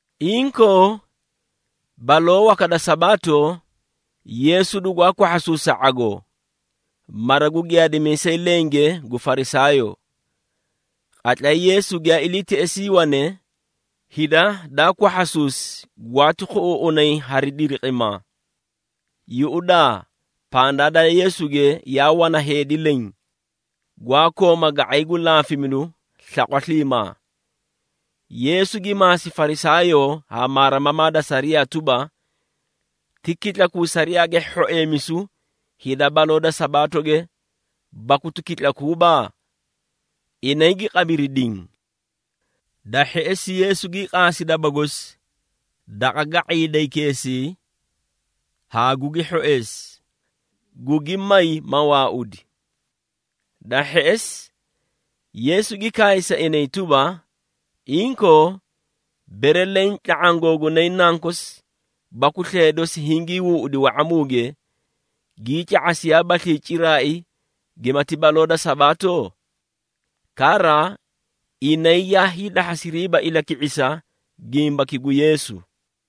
Inkoo, baloo waka da Sabaato, Yeesu dugwaa kwahhasuusi sa ⁄agoo, mara gu giyaadimiisay lenge gu Farisaayoo. Qatlay Yeesu giyaa ilii teꞌesii wane, hida daa kwahhasuusi, gwaati khuꞌuuꞌunay hari diliqimaa. Yuꞌudaa, pandaa da Yeesuge yaa wana heedi leẽ, gwaa kooma ga⁄ay gu laafimidu slaqwa sliimaa. Yeesu gi maasi Farisaayoo haa maarimamaa da sariyaa tuba, “Ti kitlakuu sariyaage hhoeemisu hida baloo da Sabaatoge, baku ti kitlakuuba?” Inay gi qabiri diĩ. Da hheꞌesi Yeesu gii qaasi daba gosi daqa ga⁄iidaykeesii haa gugi hhoeesi, gugi may, ma waaudi. Da hheꞌesi, Yeesu gi kaay sa inay tuba, “Inkoo, bere leẽ tla⁄aã googunay nankosi baku slee dosi hingii huuꞌudi wa⁄amuge, gii ca⁄asiyaabaslii ciraai gimati baloo da Sabaato?” Kara, inay yaa hiidahhasiriiba ilaki⁄isa gimbaki gu Yeesu.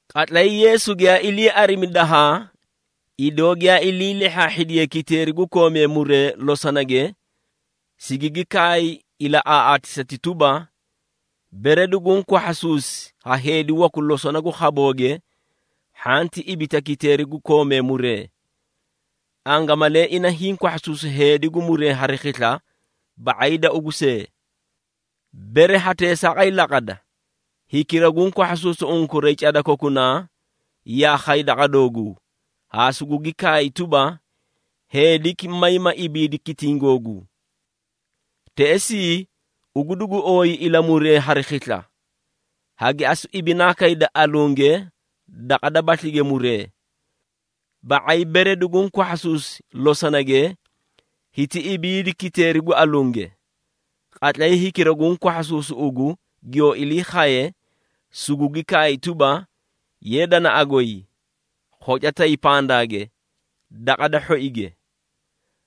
Qatlay Yeesu giyaa ilii arimi dahaa, idoo giyaa ilii lehhaahhidiyee kiteeri gu koomee muree losonage, sigigi kaay ilaꞌaaꞌaatisati tuba, “Bere duguũ kwahhasuusi ha heedi waku losona gu khabooge, hhanti ibita kiteeri gu koomee muree. Angamalee ina hiĩ kwahhasuusi heedi gu muree hari khisla ba⁄ay da ugu see. Bere ha teesaaqay laqada, hikira guũ kwahhasuusu unkuray cada kokunaa, yaa khay daqa dooguu haa sugugi kaay tuba, ‘heediki may ma ibiidi kitiĩ googuu.’ Teꞌesii, ugu dugu ooyi ilamuree hari khisla. Hagi asu ibinaa kayda alunge daqa dabaslige muree. Ba⁄ay bere duguũ kwahhasuusi losonage, hiti ibiidi kiteeri gu alunge. Qatlay hikira guũ kwahhasuusu ugu giyoo ilii khaye, sugugi kaay tuba, ‘Ye danaꞌa goy, khoca tay pandaage, daqa da hhoige.’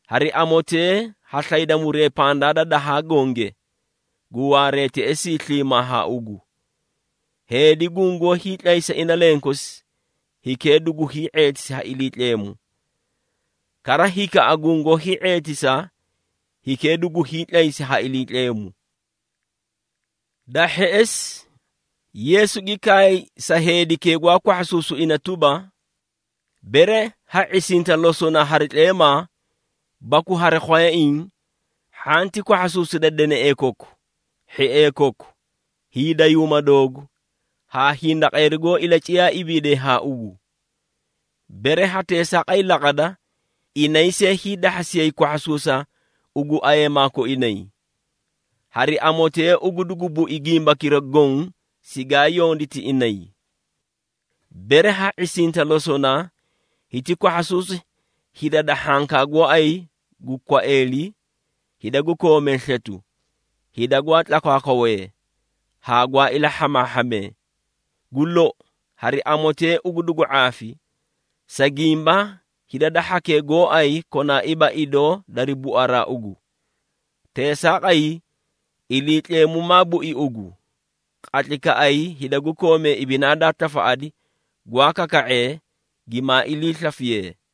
Hari amotee ha slayda muree pandaa da dahaa gonge, gu waaree teꞌesii sliimaa haa ugu. Heedi gungoó hiitlaysa ina lenkosi, hikee dugu hii⁄eetisi ha Iliitleemu. Kara, hikaꞌa gungoó hii⁄eetisa, hikee dugu hiitlaysi ha Iliitleemu.” Da hheꞌesi, Yeesu gi kaay sa heedikee gwaa kwahhasuusu ina tuba, “Bere ha ⁄isinta losona hari tleemaa baku hari khwayaiĩ, hhanti kwahhasuusida deneꞌee koku, hhiee koku, hiidayuuma doogu haa hindaqeeri goó ilaciyaa ibiidee haa ugu. Bere ha teesaaqay laqada, inay see hiidahhasiyay kwahhasuusa ugu ayeemaa koinay. Hari amotee ugu dugu bui gimbakira goõ sigaa yonditi inay. Bere ha ⁄isinta losona, hiti kwahhasuusi hida da hhankaa gooay gu kwaeeli, hida gu koomee sletu, hida gwaa tlakwaakwawee haa gwaa ilahhamaahhamee. Gu lou, hari amotee ugu dugu ⁄aafi, sa gimba hida da hhakee gooay konaaiiba idoo dari buaraa ugu. Teesaaqay, Iliitleemu maa bui ugu, qatlaykaꞌay hida gu koomee ibinaa daa tafaꞌadi gwaa kaka⁄ee, gimaa iliislafiyee.”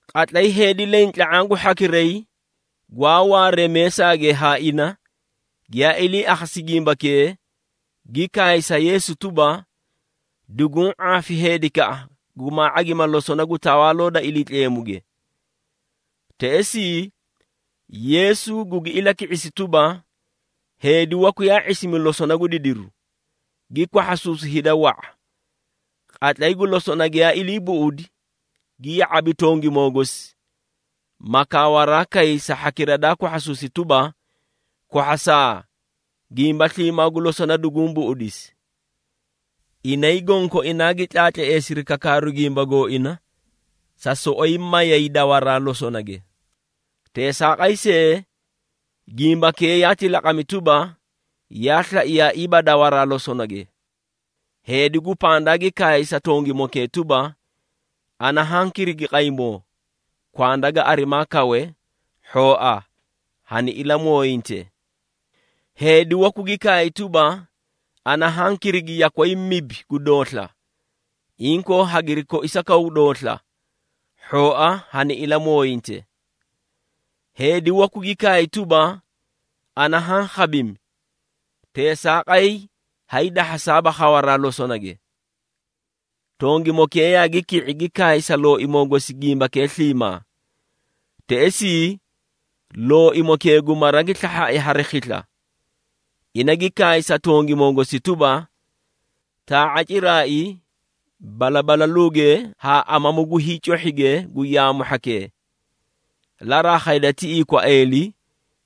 Qatlay heedi leẽ tla⁄aã gu hhakiray gwaa waaree meesaage haa ina, giyaa ilii akhasi gimbakee, gi kaay sa Yeesu tuba, “Duguũ ⁄aafi heedikaꞌa gumaa ⁄agima losona gu Tawaaloo da Iliitleemuge.” Teꞌesii, Yeesu gugi ilaki⁄isi tuba, “Heedi waku yaa ⁄isimi losona gu didiru, gi kwahhasuusi hida wa⁄a. Qatlay gu losona giyaa ilii buꞌudi, gi ya⁄abi tongimoo gosi, ma kaawaraa kay sa hhakira daa kwahhasuusi tuba, ‘Kwahhasaa, gimba sliimaa gu losona duguũ buꞌudisi.’ Inay gonkoinaa gi tlaatleesiri kakaaru gimba gooina, sa soꞌoyi mayay dawaraa losonage. Teesaaqay see, gimbakee yaati laqami tuba, yaa slaiyaaiiba dawaraa losonage. Heedi gu pandaa gi kaay sa tongimokee tuba, ‘Ana haã kirigi qaymoo, kwanda ga arimaa kawe, hhooa hani ilamooyinte.’ Heedi waku gi kaay tuba, ‘Ana haã kirigi yakway mibi gu doosla. Inkoo, hagiri koisakaw doosla, hhooa hani ilamooyinte.’ Heedi waku gi kaay tuba, ‘Ana haã khabimi, teesaaqay haay dahhasaaba khawaraa losonage.’ Tongimokee yaagi ki⁄i, gi kaay sa looimoo gosi gimbakee sliimaa. Teꞌesii, looimokee gu mara gi slahhaai hari khisla. Ina gi kaay sa tongimoo gosi tuba, ‘Taa⁄a ciraai balabalaluuge haa amamu gu hiicohhige gu yaamu hhakee, laraa khayda tiꞌii kwaeeli,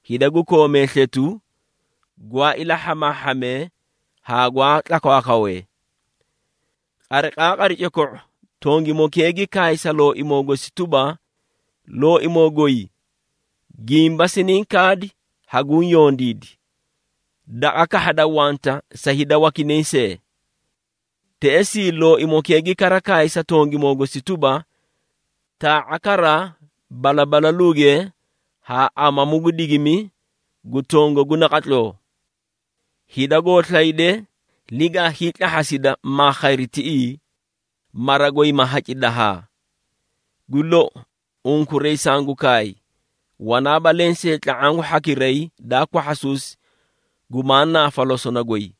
hida gu koomee sletu, gwaa ilahhamaahhamee haa gwaa tlakwaakwawee.’ Qariqaaqari coko⁄o, tongimokee gi kaay sa looimoo gosi tuba, ‘Looimoo goy, gimba siniĩ kaadi haguũ yondiidi. Daqa kahhada wanta sa hida wakinay see.’ Teꞌesii, looimokee gi kara kaay sa tongimoo gosi tuba, ‘Taa⁄a kara, balabalaluuge haa amamu gu digimi gu tongagu naqatloo. Hida goo slayde, ligaa hiitlahhasida maa khayri tiꞌii, mara goy ma haci dahaa. Gu lou, unkuray sangu kaay, wanaaba lensee tla⁄aã gu hhakiray daa kwahhasuusi, gumaa naafa losona goy.’”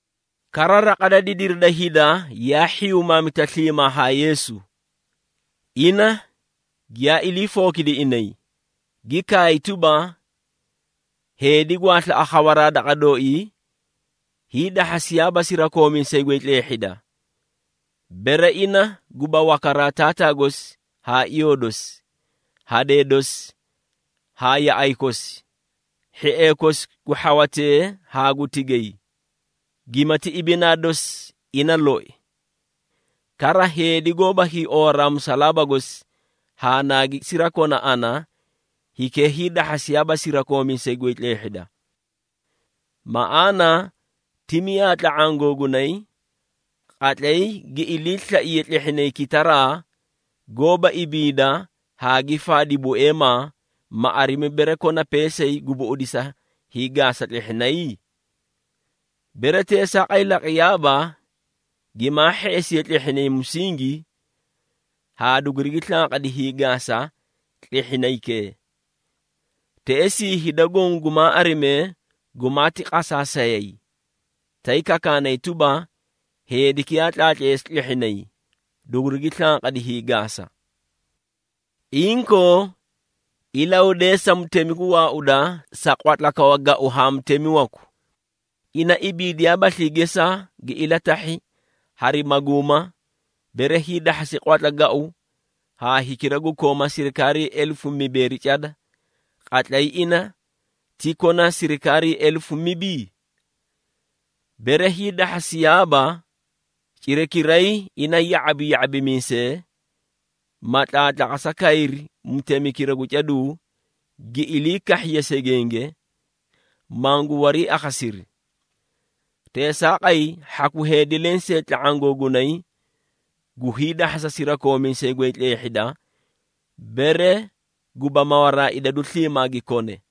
Kara, raqa da didiri da hida yaa hhiyumaamita sliimaa haa Yeesu. Ina giyaa ilii fookidi inay, gi kaay tuba, “Heedi gwaa slaꞌa khawaraa daqa dooii, hiidahhasiyaaba sirakoomiisay goy tleehhida, bere ina guba wakaraa taataa gosi haa iyoo dosi, hadee dosi haa yaꞌay kosi, hhiee kosi gu hhawatee haa gu tigay, gimati ibinaa dosi ina loi. Kara, heedi goóba hiiowaraa musalaaba gosi haa naagi sirakona ana, hikee hiidahhasiyaaba sirakoomiisay goy tleehhida. Maꞌaana, ti miyaa tla⁄aã googunay, qatlay gi iliislaiye tlehhinay kitaraa, goóba ibiida haa gi faadi bueemaa, ma arimi bere kona peesay gu buꞌudisa hiigaasa tlehhinay? Bere teesaaqay laqiyaaba, gimaa hheꞌesi tlehhinay musingi, haa dugurigi slanqadi hiigaasa tlehhinaykee. Teꞌesii hida goõ gumaa arimee, gumaati qasaasayay, tay kakaanay tuba, ‘Heediki yaa tlaatleesi tlehhinay, dugurigi slanqadi hiigaasa.’ Inkoo, ilahudeesa mutemi gu waauda sa qwatla kawa gau haa mutemi waku. Ina ibiidiyaabaslii gesaa, gi ilatahhi hari maguuma, bere hiidahhasi qwatla gau haa hikira gu koomaa sirikaarii elefu mibeeri cada, qatlay ina ti kona sirikaarii elefu mibi? Bere hiidahhasiyaaba, cirakiray ina ya⁄abi ya⁄abimiisee, ma tlaatlaqasa kayri mutemikira gu caduu, gi ilii kahhiye segenge, mangu wariiakhasiri. Teesaaqay, hhaku heedi lensee tla⁄aã googunay, gu hiidahhasa sirakoomiisay goy tleehhida, bere guba mawaraa idadu sliimaa gi kone.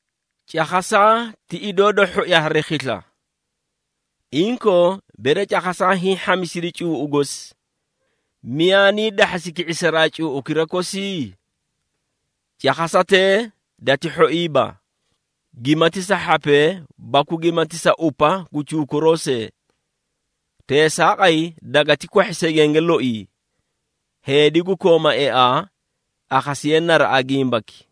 Cakhasaa ti idoo da hhoi hari khisla. Inkoo, bere cakhasaa hiĩ hhamisidi cuuꞌu gosi, miyaa nii dahhasi ki⁄isaraa cuuꞌukira kosi? Cakhasatee dati hhoiiba, gimati sa hhapee baku gimati sa upa gu cuukuroo see. Teesaaqay dagati kwahhi segenge loii. Heedi gu kooma eaa, akhasiye naraꞌa gimbaki.”